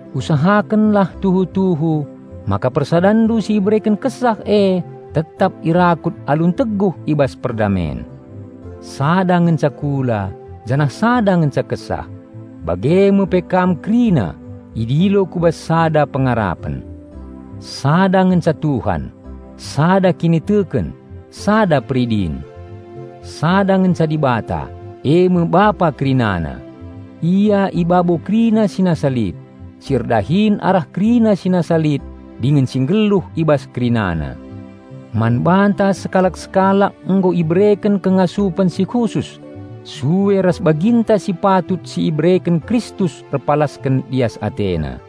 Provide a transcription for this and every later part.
Usahakenlah tuhu-tuhu maka persadanndu si ibereken Kesah e tetap irakut alu enteguh i bas perdamen. Sada ngenca kula, janah sada ngenca Kesah. Bage me pe kam kerina idilo ku bas sada pengarapen. Sada ngenca Tuhan, sada kiniteken, sada peridin; sada ngenca Dibata, eme Bapa kerinana. Ia i babo kerina si nasa lit, si erdahin arah kerina si nasa lit dingen si nggeluh i bas kerinana. Man banta sekalak-sekalak nggo ibereken kengasupen si khusus sue ras baginta si patut si ibereken Kristus erpalasken lias AteNa.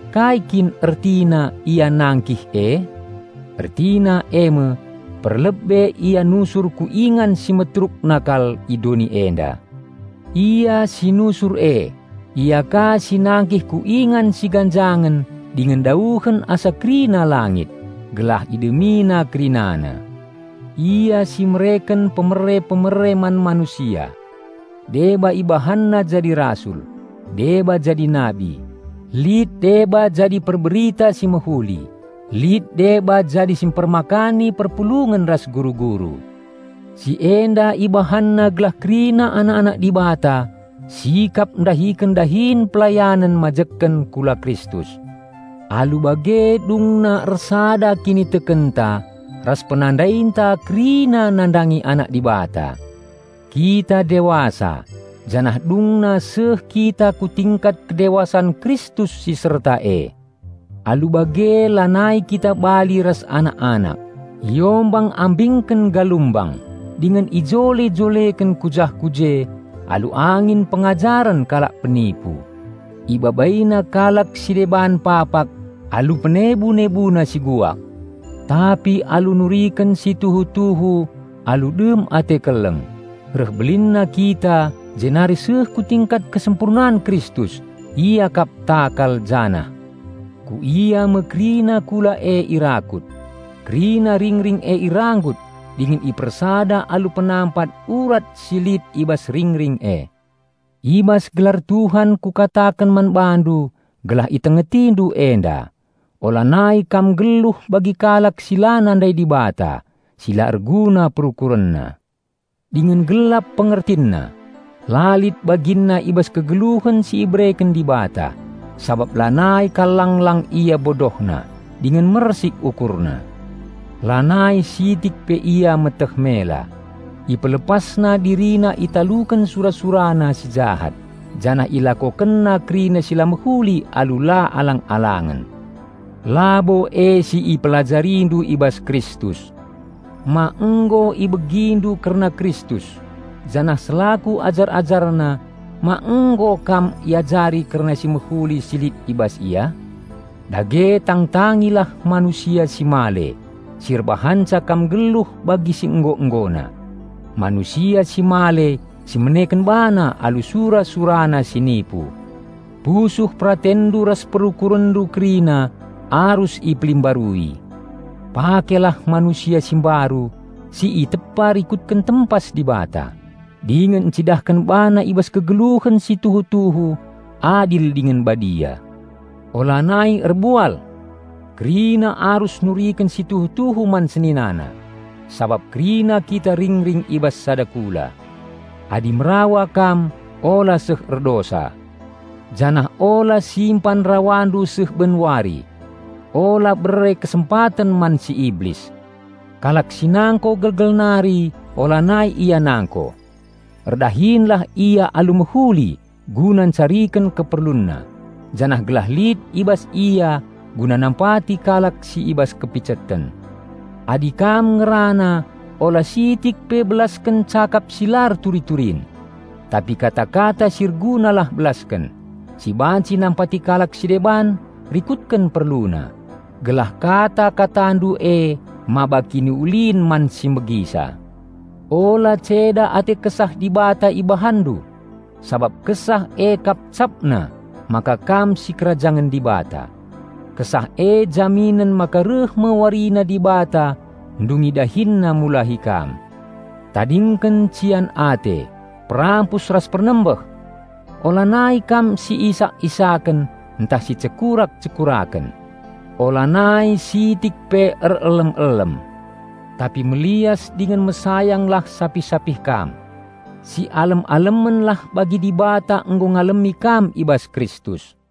Kai kin ertina "Ia nangkih" e? Ertina eme: perlebe Ia nusur ku ingan si meterukna kal, i doni enda. Ia si nusur e, Ia ka si nangkih ku ingan si ganjangen dingen dauhen asa kerina langit, gelah IdemiNa kerinana. Ia si "mereken pemere-pemere man manusia." Deba IbahanNa jadi rasul, deba jadi nabi; lit deba jadi perBerita si Mehuli, lit deba jadi si mpermakani perpulungen ras guru-guru. Si enda IbahanNa gelah kerina anak-anak Dibata sikap ndahiken dahin pelayanen majekken kula Kristus. Alu bage dungna ersada kinitekenta ras penandainta kerina nandangi Anak Dibata; kita dewasa, janah dungna seh kita ku tingkat kedewasan Kristus si serta e. Alu bage lanai kita bali ras anak-anak, iombang-ambingken galumbang dingen ijole-joleken ku jah ku je alu angin pengajaren kalak penipu; ibabaina kalak si deban papak alu penebu-nebuna si guak. Tapi alu nuriken si tuhu-tuhu alu dem ate keleng, reh belinna kita jenari seh ku tingkat kesempurnan Kristus. Ia kap takal janah, ku Ia me kerina kula e irakut. Kerina ringring e iranggut dingen ipersada alu penampat urat si lit i bas ringring e. I bas gelar Tuhan kukataken man bandu gelah itengetindu enda: ulanai kam nggeluh bagi kalak si la nandai Dibata, si la erguna perukurenna, dingen gelap pengertinna. La lit baginna i bas kegeluhen si ibereken Dibata, sabap lanai kal lang-lang ia bodohna, dingen mersik ukurna. Lanai sitik pe ia meteh mela; ipelepasna dirina italuken sura-surana si jahat, janah ilakokenna kerina si la mehuli alu la alang-alangen. Labo e si ipelajarindu i bas Kristus. Ma nggo ibegindu kerna Kristus, janah selaku ajar-AjarNa, ma nggo kam iajari kerna si mehuli si lit i bas Ia? Dage tangtangilah manusia si male, si erbahanca kam nggeluh bagi si nggo-nggona. Manusia si male si meneken bana alu sura-surana si nipu. Pusuh peratenndu ras perukurenndu kerina arus ipelimbarui. Pakelah manusia si mbaru si itepa rikutken tempas Dibata, dingen encidahken bana i bas kegeluhen si tuhu-tuhu adil dingen badia. Ulanai erbual! Kerina arus nuriken si tuhu-tuhu man seninana, sabap kerina kita ringring i bas sada kula. Adi merawa kam, ula seh erdosa. Janah ula simpan rawandu seh ben wari. Ula bere kesempaten man si iblis. Kalak si nangko gelgel nari, ulanai ia nangko. Erdahinlah ia alu mehuli guna ncariken keperlunna, janah gelah lit i bas ia guna nampati kalak si i bas kepiceten. Adi kam ngerana ula sitik pe belasken cakap si la erturi-turin. Tapi kata-kata si ergunalah belasken, si banci nampati kalak si deban rikutken perluna, gelah kata-katandu e maba kiniulin man si megisa. Ula ceda ate Kesah Dibata ibahanndu, sabap Kesah e kap capna maka kam sikerajangen Dibata. Kesah e jaminen maka reh me warina Dibata ndungi DahinNa mulahi kam. Tadingken cian ate, perampus ras pernembeh. Ulanai kam si isak-isaken ntah si cekurak-cekuraken. Ulanai sitik pe erelem-elem. Tapi melias dingen mesayanglah sapih-sapih kam. Si alem-alemenlah bagi Dibata nggo ngalemi kam i bas Kristus.